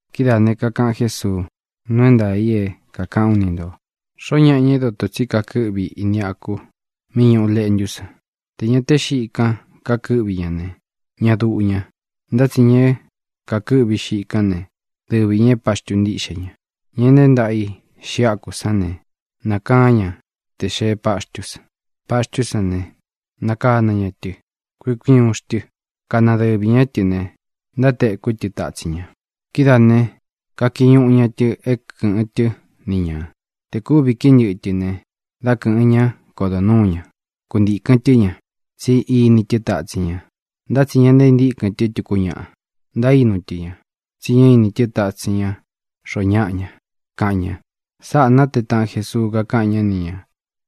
Kidáā ne, kakaꞌan Jésuu: —Nuu é ntaā i é kākaꞌán u ni ntō: xoó ñaꞌa, ña é dotō tsí kakɨ́ꞌvi ini aku mí ñūꞌu leꞌntú san, tē ña té xiꞌi kan kukɨ́ꞌvi ña ne, ña duꞌu ña. Ntá tsi ña é kakɨ́ꞌvi xiꞌi kán ne, dɨvi ñā é paxtu ntíꞌxe ña. Ña nteé ntaꞌa i xiꞌi áku sán ne, nakaán ña tē xee páxtú san. Paxtú san ne, nākana ña tɨ, kui uun kui uun xtɨ, kána dɨvī ñá tɨ ne, ntátekú tɨ tatsin ña. Kidáā ne, kakiñuꞌu ña tɨ é kɨ̄ꞌɨn tɨ́ ni ñā. Tē kúvi kií ntɨꞌɨ tɨ ne, dá kɨ̄ꞌɨn ñá, kodo nuū ñá, kuntīkɨn tɨ́ ña, tsí ini tɨ́ tatsin ña. Ntá tsi ña ntaíntíkɨn tɨ́ tuku ñáꞌa. Ntaínu tɨ ña, tsí ña ini tɨ́ tatsin ña xoo ñáꞌa ña —kaꞌan ña. Sáꞌā nátee taꞌan Jesuu, kakaꞌan ñá ni ñā,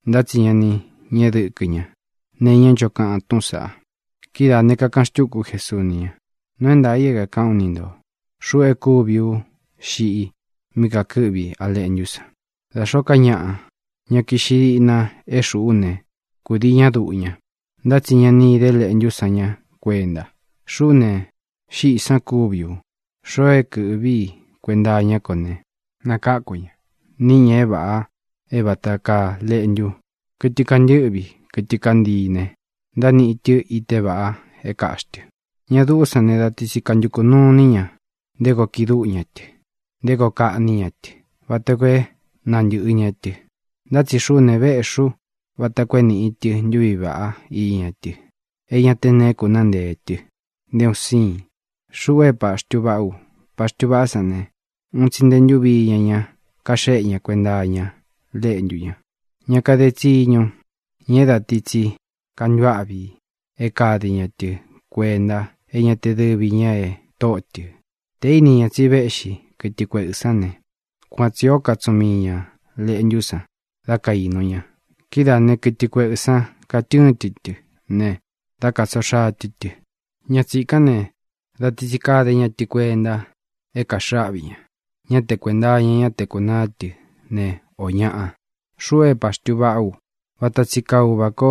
ntá tsi ña ni ñéꞌe dɨkɨ ña nee iñá ncho kaꞌan túꞌūn saꞌa. Kidáā ne, kakaꞌan xtúku Jesuu ni ña: —Nuu é ntaā i é kākaꞌán u ni ntō: Xuꞌu e kúvi ú xiꞌi mí kantɨ́ꞌvi á leꞌntú san. Da xóō ká ñaꞌa, ña kiꞌxi díꞌna é xuꞌú ne, kūdii ñá duꞌu ña. Ntá tsi ña ni íde leꞌntú san ñá kuenta. Xuꞌú ne, xíꞌī san kúvi u. Xoo é kɨ̄ꞌví i kuenta iñá ko ne, nakáku ña. Níꞌi ñā é vāꞌa é vata kaa leꞌntu, kɨtɨ kantɨ́ꞌvi, kɨtɨ kantii ne, ntániꞌi tɨ́ ite vaꞌa é kāꞌxi tɨ. ʼÑa duꞌú san ne, da ti tsi kantukū nuu iní ña nté koo kiꞌi dúꞌu ña tɨ, nté koo kaꞌní ña tɨ, vata koo é nantɨ̄ꞌɨ ña tɨ. Ntá tsi xuꞌú ne, véꞌxī ú vata koo é nīꞌi tɨ ntuví vaꞌá iña tɨ, é ña te neé kunaá nteē tɨ nté un siin. Xuꞌu é paxtu vaꞌá u. Paxtu vaꞌá san ne, uun tsi nte ntúvi iña ña kaxéꞌe ña kuenta iña léꞌntu ña. Ña kade tsiñu, ña é dā ti tsi kantuáꞌvi é kade ña tɨ kuenta, é ña te dɨvi ñā é tóꞌo tɨ, tē íni ña tsi véꞌxi kɨtɨ kueꞌɨ̄ sán ne, kuan tsī ó katsuꞌun mii ña lēꞌntú san da kainu ña. Kidáā né, kɨtɨ kueꞌɨ̄ sán katɨ́ɨn tɨ tɨ ne, dá katsoo xaa tɨ tɨ. Ña tsīkán ne, dā ti tsi kade ña tɨ kuenta é kaxɨꞌɨ áꞌvi ña; ñá te kuēnta iña ñá te kūnaá tɨ ne, o ñáꞌa. ʼXuꞌu é paxtu vaꞌá u. Vata tsi kaa Uvā ko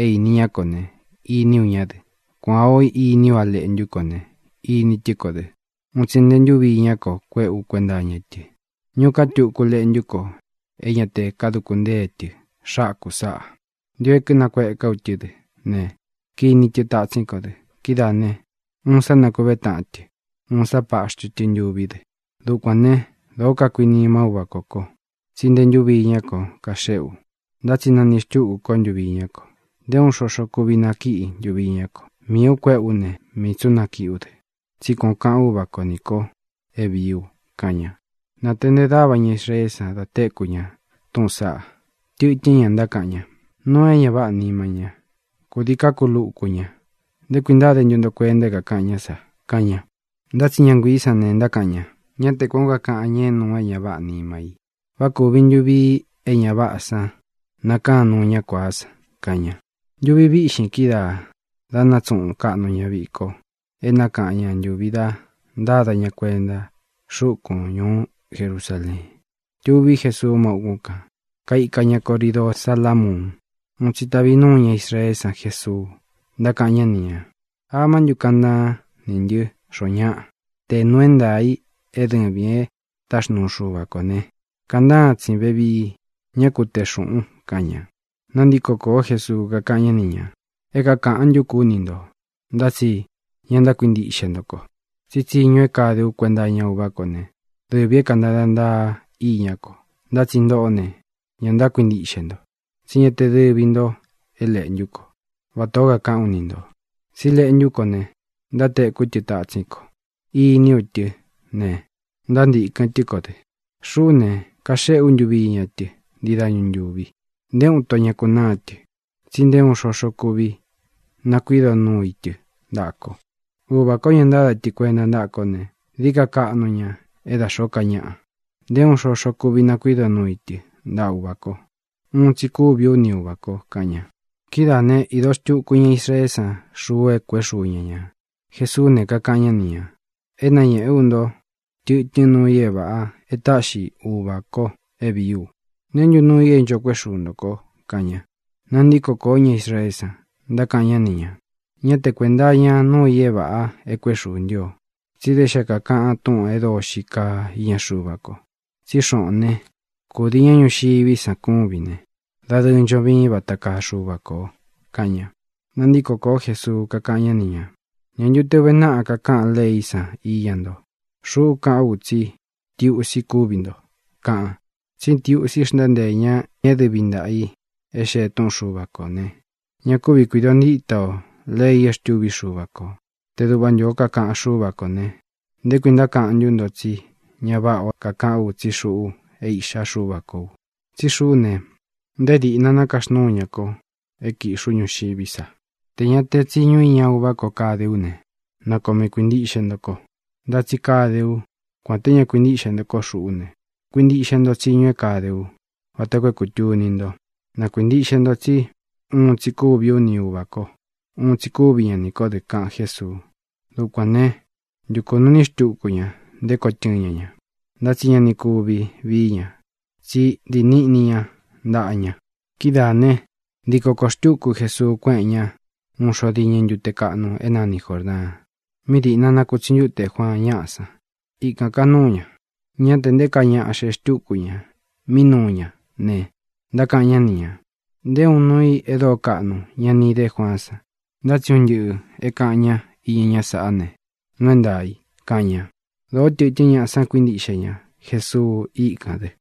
é īni ñá ko ne, iní u ñá dɨ. Kuān ó iní u leꞌntú ko ne, ini tɨ́ ko dɨ. Uun tsi nté ntūvi iñá ko kuéꞌe ú kuenta iña tɨ. Ñuꞌu ká tuku leꞌntú ko é ña te kaduku ntée tɨ xáku sāꞌa. Ntio é kínakueká u tɨ́ dɨ ne, kiní tɨ tatsín ko dɨ. Kidáā ne, uun sá nakuvé taꞌan tɨ, uun sá paxtu tɨ ntuví dɨ. ʼDukuān né, dōó kakuinimá Uvā kó ko, tsi nté ntūvi iñá ko kaxéꞌe u. Ntá tsi naniꞌi xtúku kó ntuvi iñá ko. Nté uun xoxo kúvi nakíꞌi ntuvi iñá ko. Miī u kuéꞌe ú ne, mii tsī ú nakiꞌí u dɨ. Tsí kuan ō kaꞌan Úvā kó nī ko é vīí u —kaꞌan ña. Nāteꞌnte dáva ña Israeé san da téku ña túꞌūn saꞌa. Tɨtɨ́n ña ntákaꞌan ña: —Nuu é ña váꞌā nima ña. Kūdii kákuluku ña. ¿Nté kui ntáde ntu nto kuenta é kākaꞌan ñá sa? —kaꞌan ña. Ntá tsi ña nguiī sán ne, ntákaꞌan ña: —Ñá te kuān ó kakaꞌan ña é nuu é ña váꞌā nima i. ¿Vá kūvi ntu vii é ña váꞌā san nakaan nuu ñá kuāá san? —kaꞌan ña. Ntuvi vīꞌxín kídaā da nátsuꞌun kaꞌnu ña viko é nakaꞌan ña ntūvi da ntáda ña kuenta xúkūn ñuú Jerusaleen. Tuví Jesuu má ukún kān, kaika ña Coridoo Sálamuun. Uun tsi tavi núu ñá Israeé san Jesuu, ntákaꞌan ñá ni ñā: —¿Amá ntu kaꞌan ntaan ní ntɨ xoo ñáꞌan? Tē nuu é ntaā i é dɨvīn é táxnuu Xuva kō ne, kaꞌan ntáan tsīn vevii; ñá ku tee xūꞌun —kaꞌan ña. Nantíko kōó Jesuu, kakáꞌan ñá ni ñā: —É kākaꞌan ntú ku ú ni ntō, ntá tsi ña ntákuintiꞌxe nto ko. Tsí tsiñu é kade ú kuenta iña Uvá ko ne, dɨvī é kantada ntaa iñá ko. Ntá tsi ntoꞌó ne, ña ntákuintiꞌxe nto, tsí ña te dɨvi ntō é leꞌntú ko, vatā ó kakaꞌán u ni ntō. Tsí leꞌntú ko ne, ntátekú tɨ tatsín ko. Iní u tɨ́ ne, ntántīkɨn tɨ́ ko dɨ. Xuꞌú ne, kaxéꞌe ú ntuvi iña tɨ ntii dáñu ntūvi. Nté uun ito ña kunáa tɨ, tsi nté uun xoxo kuvi nakuido núu i tɨ ntaꞌa ko. Uvā kó, ña ntáda tɨ kuenta ntáꞌa kó ne, dií ka kaꞌnu ña é da xóo ká ñaꞌa. Nté uun xoxo kuvi nakuido núu i tɨ ntaꞌa Uvā ko. Uun tsi kúvī ú ni Uvā ko —kaꞌan ña. Kidáā né, īdo xtuku ña Israeé san xuu é kuēꞌé xuu ña ñā. Jesuú ne, kakaꞌan ñá ni ñā: —É nañēꞌé u nto tɨtɨ́n nuu i é vāꞌa e táꞌxi Uvā ko é vīí u. ¿Neé ntu nuu i é ncho kuéꞌe xuu ntō ko? —kaꞌan ña. Nantíko kōo ña Israeé san, ntákaꞌan ñá ni ñā: —Ñá te kuēnta iña núu i é vāꞌa e kuéꞌe xuū ntɨ́ o, tsí da xé kakaꞌan túꞌūn e dóo xii kaa íña Xuva ko. Tsí xoꞌōn ne, kūdii ñá ñuxiví san kúvin ne, dadɨɨ ncho viín vata kaa Xuva kō —kaꞌan ña. Nantíko kōó Jesuu, kakáꞌan ñá ni ñā: —¿Ñā ntu te uve náꞌa kakaꞌan leí san iña nto: “Xuꞌú kaꞌán u tsí ntiusi kúvi nto”, kaꞌan? Tsí ntiusi xntánteē ña é dɨvi ntaꞌa ī e xee túꞌun Xuva kō ne, ña kúvi kuīdo ntíta o lei e xtúvi Xuva kō. Te duꞌva ntū ó kakaꞌan Xúva kō ne, ¿nté kui ntákaꞌan ntú nto tsí ña váꞌa o kakaꞌán u tsí xuꞌu é Iꞌxá Xuva kō u? Tsí xuꞌú ne, nté diꞌna nákaxnúu ña ko é kīꞌxi ú ñuxiví sa. Tē ña te tsiñu iña Uvá ko kadé u ne, na koo mii kuīntiꞌxe nto ko. Ntá tsi kade u. Kuān té ña kuintíꞌxe ntō kó xuꞌú ne, kuintiꞌxe nto tsiñu é kade ú vata koo é kūtuni ntó, na kuīntiꞌxe nto tsí uun tsi kúvi ú ni Uvā kó, uun tsi kuvi ña nī kó dɨ —kaꞌan Jésuu. Dukuān né, ntukū nuu iní xtuku ña nté koo tɨ́ɨn ña ña, ntá tsi ña ni kuvi vií ña, tsi ntií niꞌni ña ntaꞌa ña. Kidáā né, ntiko kōo xtúku Jesuu, kuéꞌen ña ūun xo diñɨ ntute kaꞌnu é nani Jōrdaan, mí dīꞌna nakutsi ntúte Juaan ñáꞌa san. Ikān kanúu ña. Ñá te nté kaa ñaꞌa xee xtúku ñā mí nuu ña ne, ntákaꞌan ñá ni ñā: —Nté uun nuu i é dóo kaꞌnu ña ni idé Juaán san, ntá tsi un ntɨꞌɨ̄ é kāꞌan ñá iña ñá saꞌá ne, nuu é ntaā i —kaꞌan ña. Dōo tɨtɨ́n ñaꞌa san kuíntiꞌxe ña Jesuu íkān dɨ.